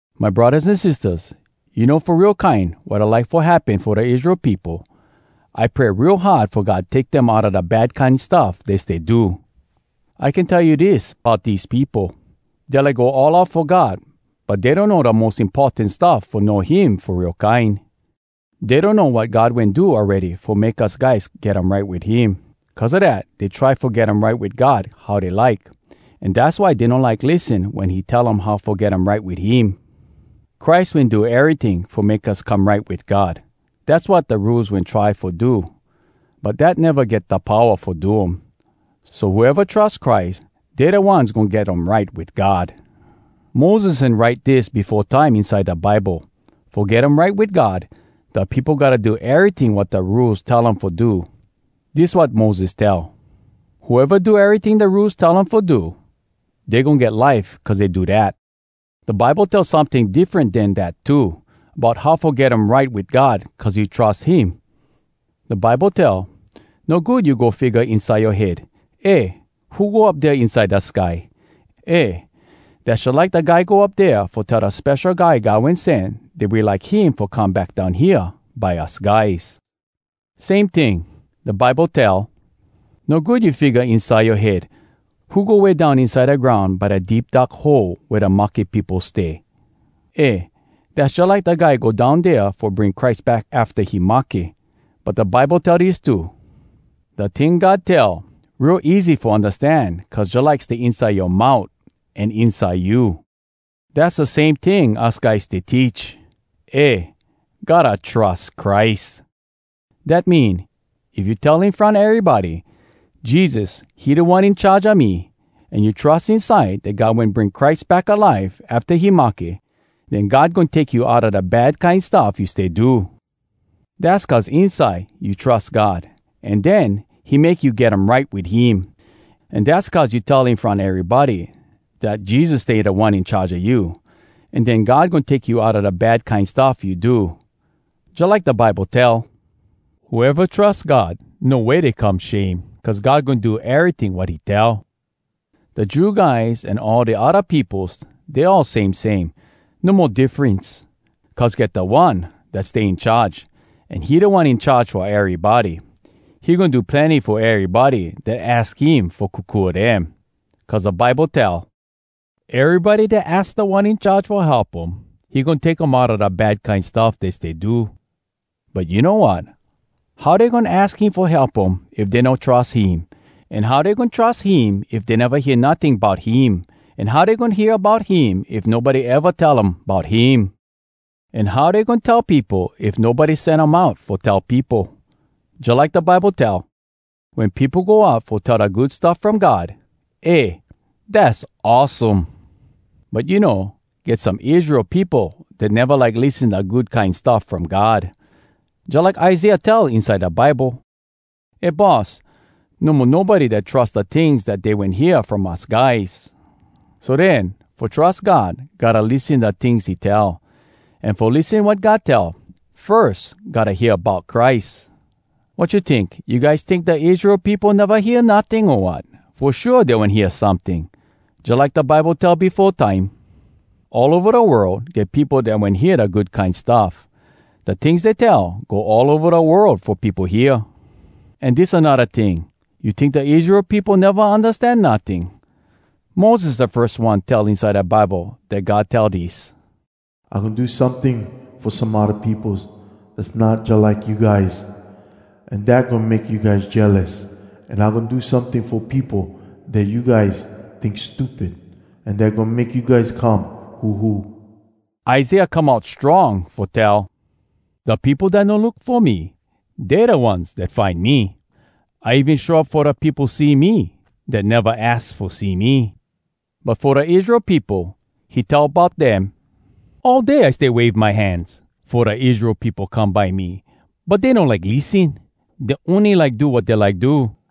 My braddahs an sistahs, you know fo real kine wat I like fo happen fo da Israel peopo? I pray real hard fo God take dem outa da bad kine stuff dey stay do. I can tell you dis bout dese peopo: Dey like go all out fo God, but dey donno da mos importan stuff fo know him fo real kine. Dey donno wat God wen do awready fo make us guys get um right wit him. Cuz a dat, dey try fo get um right wit God how dey like, an dass why dey no like lissen wen he tell um how fo get um right wit him. Christ wen do eryting fo make us come right wit God. Dass wat da Rules wen try fo do, but dat neva get da powa fo do um. So whoeva trus Christ, dey da ones goin get um right wit God. Moses wen write dis befo time inside da Bible: Fo get um right wit God, da peopo gotta do eryting wat da Rules tell um fo do. Dis wat Moses tell: “Whoeva do eryting da Rules tell um fo do, dey goin get life cuz dey do dat.” Da Bible tell someting diffren den dat too, bout how fo get um right wit God cuz you trus him. Da Bible tell: “No good you go figga inside yoa head, ‘Eh, who go up dea inside da sky?’” Eh, dass jalike da guy go up dea fo tell da Spesho Guy God Wen Sen dat we like him fo come back down hea by us guys. Same ting, da Bible tell: “No good you figga inside yoa head, ‘Who go way down inside da groun by da Deep Dark Hole wea da mahke peopo stay?’” Eh dass jalike da guy go down dea fo bring Christ back afta he mahke. But da Bible tell dis too: “Da ting God tell, real easy fo undastan cuz jalike stay inside yoa mout an inside you.” Dass da same ting us guys stay teach: Eh, gotta trus Christ! Dat mean, if you tell in front erybody, “Jesus, he Da One In Charge a me,” an you trus inside dat God wen bring Christ back alive afta he mahke, den God goin take you outa da bad kine stuff you stay do. Dass cuz inside you trus God, an den he make you get um right wit him. An dass cuz you tell in front erybody dat Jesus stay Da One In Charge a you, an den God goin take you outa da bad kine stuff you do. Jalike da Bible tell, “Whoeva trus God, no way dey come shame, cuz God goin do eryting wat he tell.” Da Jew guys an all da odda peopos, dey all same same. No mo diffrence. Cuz get Da One Dat Stay In Charge, an he Da One In Charge fo erybody. He goin do plenny fo erybody dat aks him fo kokua dem. Cuz da Bible tell, “Erybody dat aks Da One In Charge fo help um, he goin take um outa da bad kine stuff dey stay do.” But you know wat?! How dey goin aks him fo help um if dey no trus him? An how dey goin trus him if dey neva hear notting bout him? An how dey goin hear bout him if nobody eva tell um bout him? An how dey goin tell peopo if nobody sen um out fo tell peopo? Jalike da Bible tell, “Wen peopo go out fo tell da Good Stuff From God, eh! dass awesome!” But you know, get some Israel peopo dat neva like lissen da Good Kine Stuff From God. Jalike Isaiah tell inside da Bible: “Eh Boss! No mo nobody dat trus Da tings dat dey wen hear from us guys!” So den: Fo trus God, gotta lissen da tings he tell. An fo lissen wat God tell, firs gotta hear bout Christ. Wat you tink? You guys tink da Israel peopo neva hear notting, o wat? Fo shua dey wen hear someting! Jalike da Bible tell befo time: “All ova da world, get peopo dat wen hear da Good Kine Stuff. Da tings dey tell, go all ova da world fo peopo hear.” An dis anodda ting: “You tink da Israel peopo neva undastan notting?” Moses da firs one tell inside da Bible dat God tell dis: “I goin do someting fo some odda peopos Dass not jalike you guys. An dat goin make you guys jealous. An I goin do someting fo peopo dat you guys tink stupid, An dat goin make you guys come huhu.” Isaiah come out strong fo tell, “Da peopo dat no look fo me, Dey da ones dat find me. I even show up fo da peopo see me Dat neva aks fo see me.” But fo da Israel peopo, he tell bout dem: “All day I stay wave my hands, Fo da Israel peopo come by me, But dey no like lissen. Dey ony like do wat dey like do.”